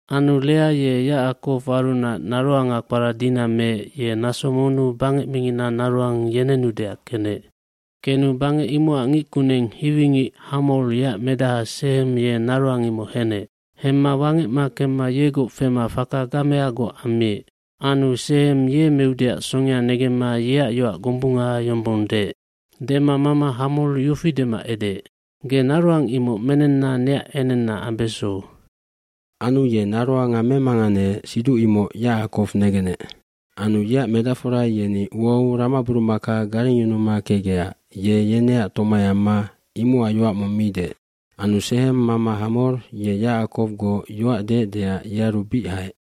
aAnu Lea ye Yacakowarunac naroanga kpara Dina meec ye naso monnu bangec mingina naroang yenenudeac kenec. Kenu bangec imocac ngickuneng hiwingic Hamor yeac medaha Sehem ye naroang imoc henec. Hemma wangecma kemma yegoc fema faka gameagoc ammiec. Anu Sehem ye meudeac songea negemma yeac yoac gombunga yombong deec. Dema mama Hamor yofi dema edeec, “Ge naroang imoc menenna neac enenna ambeso.” Anu ye naroanga memanganeec siduc imoc Yacakow negenec. Anu yeac medacfora yeni uau ramaburumaka garengyunuma kecgecac ye yeneac tomai amma imocac yoac mong mi deec. Anu Sehem mama Hamor ye Yacakowgoc yoac deecdeac yearu bic haec.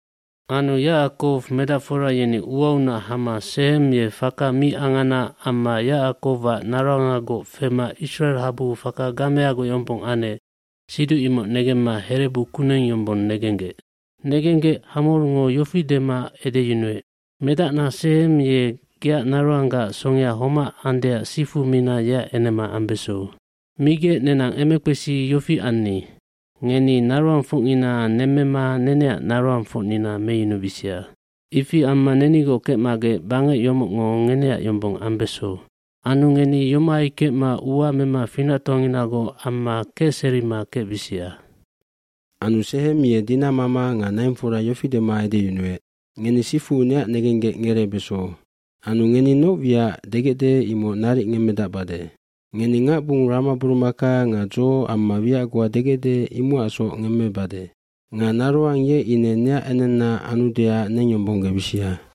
bAnu Yacakow medacfora yeni uaunac hama Sehem ye faka mi angana amma Yacackowac naroangagoc fema Isracel habuu faka gameagoc yombong anec siduc imoc negemma herebu kuneng yombong negenggec. Negenggec Hamorngo yofi dema edeyunuec, “Medacna Sehem ye geac naroanggaac songea homac andeac sifu mina yeac enema ambeso. Migec nenang emekpesi yofi anni. Ngeni naroangfocngina nemmema neneac naroangfocnina meyunubisia. Ifi amma nenigoc kecmagec bangec yomocngo ngeneac yombong ambeso. Anu ngeni yomohai kecma ua mema finactoanginagoc amma kecserima kecbisia.” Anu Sehem ye Dina mama nga naingfora yofi dema edeyunuec, “Ngeni sifu neac negenggec ngereebeso. Anu ngeni noc wiacac degecde imoc naric ngemmedacbade. Ngeni ngacbung ramaburumaka nga dzo amma wiac goa degecde imocacsoc ngemmebade. Nga naroang ye ine neac enenna anudeac nengyombonggebisia.”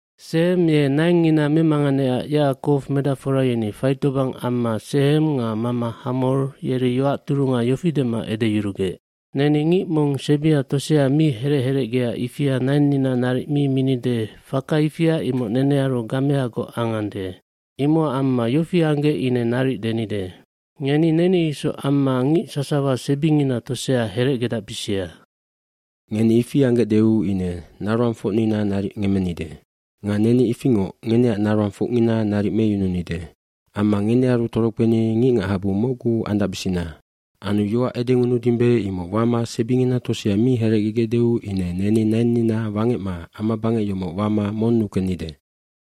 Sehem ye naingngina memanganeecac Yacakow medacfora yeni faitobang amma Sehem nga mama Hamor yeri yoac turunga yofi dema edeyurugec. “Neni ngic mong sebia tosea mi herec herecgea ifia nainnina naric mi minide faka ifia imoc nenearu gameagoc angande. Imocac amma yofi anggec ine naric denide. Ngeni neni isoc amma ngic sasawa sebingina tosea herecgedacbisia. Ngeni ifi anggecdeu ine naroangfocnina naric ngemmenide nga neni ifingoc ngeneac naroangfocngina naric meyununide. Amma ngenearu torokpeni ngicngachabu mocgu andacbisina. Anu yoac edengunudimbe imoc wama sebingina tosea mi herecgegecdeu ine neni nainnina wangecma amabangec yomoc wama monnu kennide.”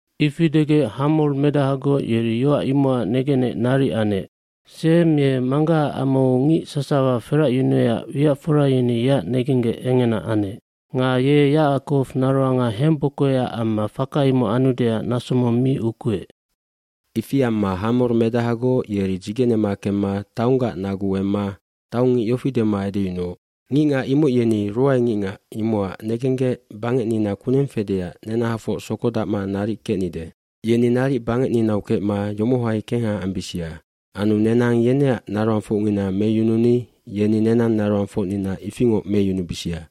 Ifi degec Hamor medahagoc yeri yoac imocac negenec naric anec. Sehem ye manggahaac amau ngic sasawa feracyunuecac wiacfora yeni yeac negenggec engena anec. Nga ye Yacakow naroanga hembokoecac amma faka imoc anudeac naso mong mi ukuec. Ifi amma Hamor medahagoc yeri dzigenema kemma taonggac naguu emma taongngic yofi dema edeyunuoc, “Ngicngac imoc yeni ruaengicngac imocac negenggec, bangecnina kuneng fedeac nenahafoc sokodacma naric kecnide. Yeni naric bangecninau kecma yomohai kengha ambisia. Anu nenang yeneac naroangfocngina meyununi yeni nenang naroangfocnina ifingoc meyunubisia.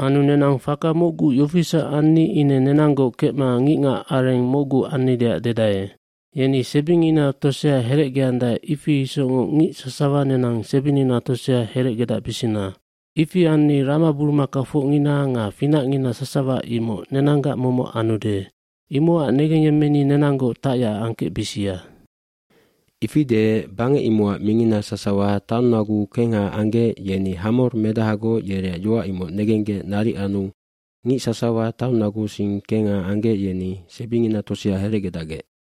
Anu nenang faka mocgu yofisac anni ine nenanggoc kecma ngicngacareng mocgu annideac dedae. Yeni sebingina tosea herecgeandae ifi isocngoc ngic sasawa nenang sebinina tosea herecgedacbisina. Ifi anni ramaburumakfocngina nga finacngina sasawa imoc nenanggac momoc anude. Imocac negengyemmeni nenanggoc tacyac angkecbisia.” Ifi deec bangec imocac mingina sasawa taonnaguu kengha anggec yeni Hamor medahagoc yereac yoac imoc negenggec naric anu ngic sasawa taonnaguusing kengha anggec yeni sebingina tosea herecgedacgec.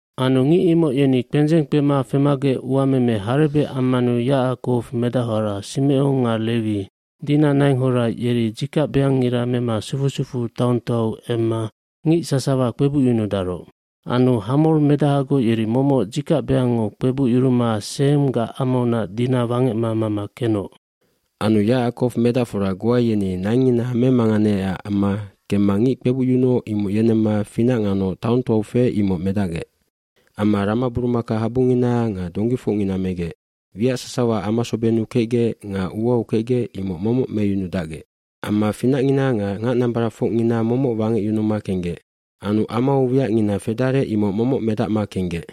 cAnu ngic imoc yeni kpendzeng kpema femagec uameme harebec ammanu Yacakow medachora Simecon nga Lewi, Dina nainghora yeri dzikacbeangngira mema sufu sufuu taongtoau emma ngic sasawa kpebucyunudaroc. Anu Hamor medahagoc yeri momoc dzikacbeangngo kpebucyuruma Sehemgac amaunac Dina wangecma mama kenoc. Anu Yacakow medacfora goa yeni naingngina memanganegecac amma kemma ngic kpebucyunuoc imoc yenemma finac nganoc taongtoau feec imoc medacgec. Amma ramaburumakahabungina nga donggifocngina megec. Wiac sasawa amasobennu kecgec nga uau kecgec imoc momoc meyunudacgec. Amma finacngina nga ngacnambaracfocngina momoc wangecyunuma kenggec. Anu amau wiacngina fedarec imoc momoc medacma kenggec.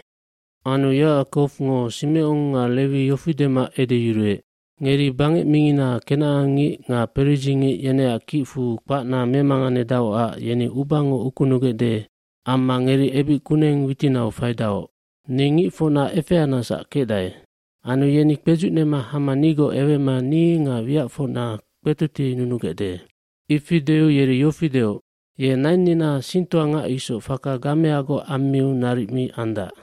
Anu Yacakowngo Simecon nga Lewi yofi dema edeyuruec, “Ngeri bangec mingina kenacangngic nga peridzingic yeneac kicfu kpacna memanganedaocac yeni ubango ukunugecde amma ngeri ebic kuneng witinau faidaoc. Ni ngicfocna efeanecsac kecdae. Anu yeni kpedzucnema hama nigoc ewema ni nga wiacfocna kpetotienunugecde.” Ifi deu yeri yofi deoc, “Ye nainnina singtoangac isoc faka gameagoc ammiu naric mi andac!”